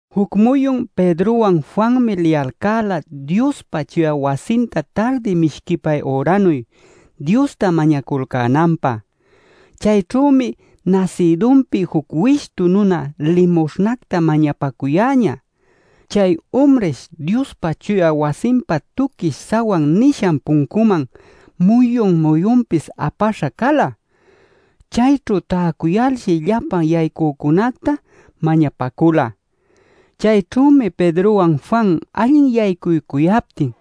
Juc muyun Pedrowan Juanmi liyalcäla Diospa chuya wasinta tardi mishquipay üranuy Diosta mañaculcänanpä. Chayćhümi nasïdunpi juc wishtu nuna limuśhnacta mañapacuyäñä. Chay umrish Diospa chuya wasinpa Tuquish Sawan nishan puncunman muyun-muyunpis apaśha cala. Chayćhu täcuyalshi llapa yaycücunacta mañapacula. Chayćhümi Pedrowan Juan allin yaycuycuyaptin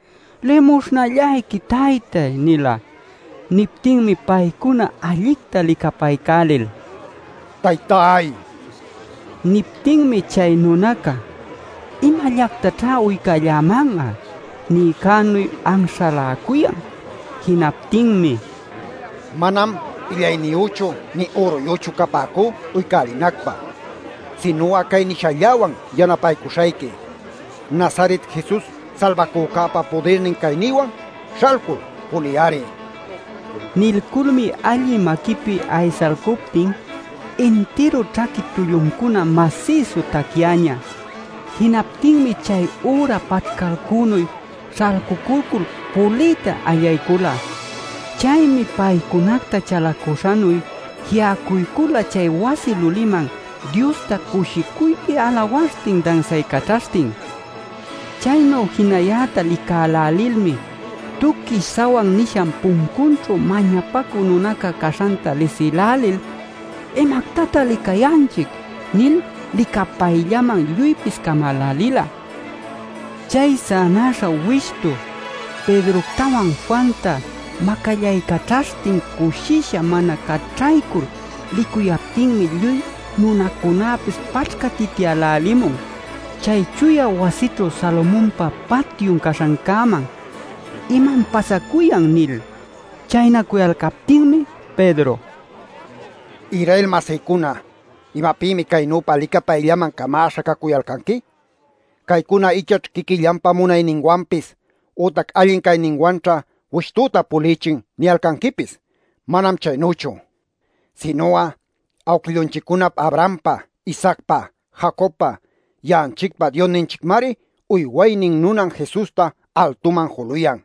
“Limuśhnallayqui taytay” nila. Niptinmi paycuna allicta licapaycälil: “¡Taytay!” nipäcula. Niptinmi chay nunaca “¿Imallactaćhá uycalläman'a?” niycänuy anśhaläcuyan. Jinaptinmi: “Manam illayniyüchu nï üruyüchu capäcú uycälinacpä. Sinu'a cay nishälläwan yanapaycuśhayqui: Nazaret Jesus Salbacücäpa pudirnin caynïwan, śhalcul puliy-ari” nila. Nilculmi allï maquipi aysalcuptin intiru ćhaqui tulluncuna masïsu tacyañä. Jinaptinmi chay üra paćhcalcünuy śhalculcul puliyta allaycula. Chaymi paycunacta chalacuśhanuy ji'acuycula chay wasi luliman Diosta cushicuypi alawaśhtin dansaycaćhaśhtin. Chaynu jinayäta licälälilmi Tuquish Sawan nisha puncunćhu mañapacü nunaca caśhanta lisïlälil “¿Imactatan licayanchic?” nil licapayllaman lluypis camälälila. Chay sänaśha wishtu Pedroctawan Juanta macallaycaćhaśhtin cushisha mana caćhaycul licuyaptinmi lluy nunacunäpis paćhcatityälälimun chay chuya wasićhu Salomonpa Patyun caśhancäman “¿Imam pasacuyan?” nil. Chaynacuyalcaptinmi Pedro: “Israel-masïcuna ¿imapïmi caynüpa licapayllaman camäśha cacuyalcanqui? ‘Caycuna ichaćh quiquillanpa munayninwanpis ütac allin cayninwanćha wishtüta pulïchin’ niyalcanquipis. Manam chaynüchu. Sinu'a awquillunchiccunap Abrahampa, Isaacpa, Jacobpa ya'anchicpa Diosninchicmari uywaynin nunan Jesusta altuman juluyan.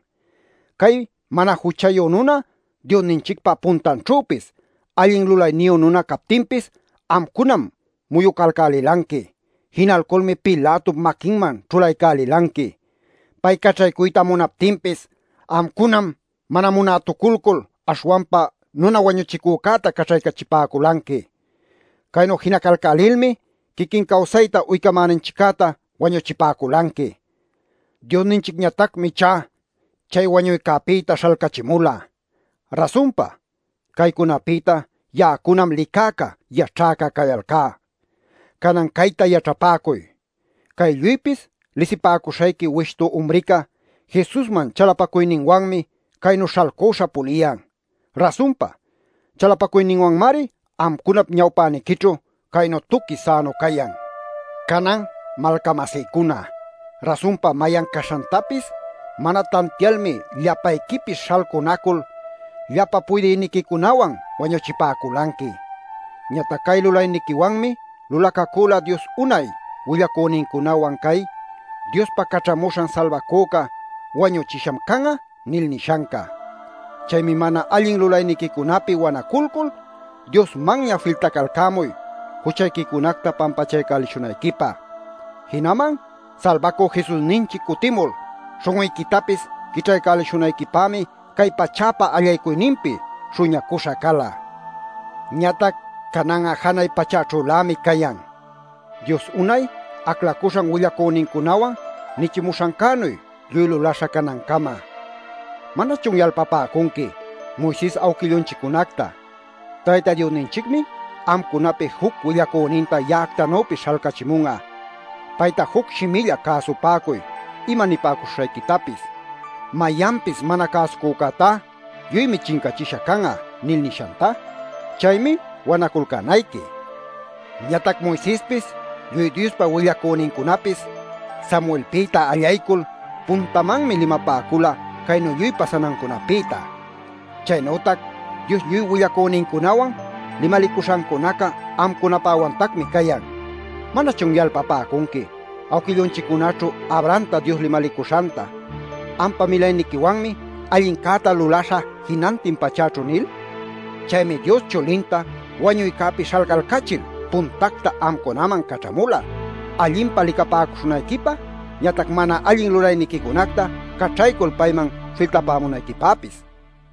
Cay mana juchayu nuna Diosninchicpa puntanćhüpis allin lulayniyu nuna captinpis amcunam muyucalcälilanqui. Jinalculmi Pilatop maquinman ćhulaycälilanqui. Pay caćhaycuyta munaptinpis amcunam mana munätuculcul aśhwanpa nuna wañuchicücäta caćhaycachipäculanqui. Caynu jinalcälilmi quiquin cawsayta uycämäninchiccäta wañuchipäculanqui. Diosninchicñatacmi ichá chay wañuycäpïta śhalcachimula. Rasunpa caycunapïta ya'acunam licäca yaćhäca cayalcá. Canan cayta yaćhapäcuy: Cay lluypis lisipäcuśhayqui wishtu umrica Jesusman chalapacuyninwanmi caynu śhalcüśha puliyan. Rasunpa chalapacuyninwanmari amcunap ñawpäniquićhu caynu tuqui sänu cayan. “Canan malca-masïcuna, rasunpa mayan caśhantapis mana tantialmi llapayquipis śhalcunacul llapa puydïniquicunawan wañuchipäculanqui. Ñatac cay lulayniquiwanmi lulacacüla Dios unay willacünincunawan cay: ‘Diospa Caćhamuśhan Salbacüca wañuchisham can'a’ nil nishanca. Chaymi mana allin lulayniquicunapi wanaculcul Diosmanña filtacalcämuy juchayquicunacta pampachaycälishunayquipä. Jinaman Salbacü Jesusninchic cutimul śhun'uyquitapis quićhaycälishunayquipämi cay pachäpa allaycuyninpi śhuñacuśha cala. Ñatac canan'a janay pachäćhülämi cayan, Dios unay aclacuśhan willacünincunawan nichimuśhancänuy lluy lulaśha canancama. ¿Manachun yalpapäcunqui Moises awquillunchiccunacta: ‘Tayta Diosninchicmi amcunapi juc willacüninta ya'actanüpis śhalcachimun'a. Payta juc shimilla cäsupäcuy ima nipäcuśhuśhayquitapis. Mayanpis mana cäsucücätá lluymi chincachisha can'a’ nil nishanta? Chaymi wanaculcänayqui. Ñatac Moisespis lluy Diospa willacünincunapis Samuelpïta allaycul puntamanmi limapäcula caynu lluy pasanancunapïta. Chaynütac Dios lluy willacünincunawan limalicuśhancunaca amcunapäwantacmi cayan. ¿Manachun yalpapäcunqui awquillunchiccunaćhu Abrahamta Dios limalicuśhanta: ‘Ampa milayniquiwanmi allincäta lulaśhä jinantin pachäćhu’ nil? Chaymi Dios chulinta wañuycäpi śhalcalcachil puntacta amcunaman caćhamula, allinpa licapäcuśhunayquipä, ñatac mana allin lulayniquicunacta caćhaycul payman filtapämunayquipäpis” nila.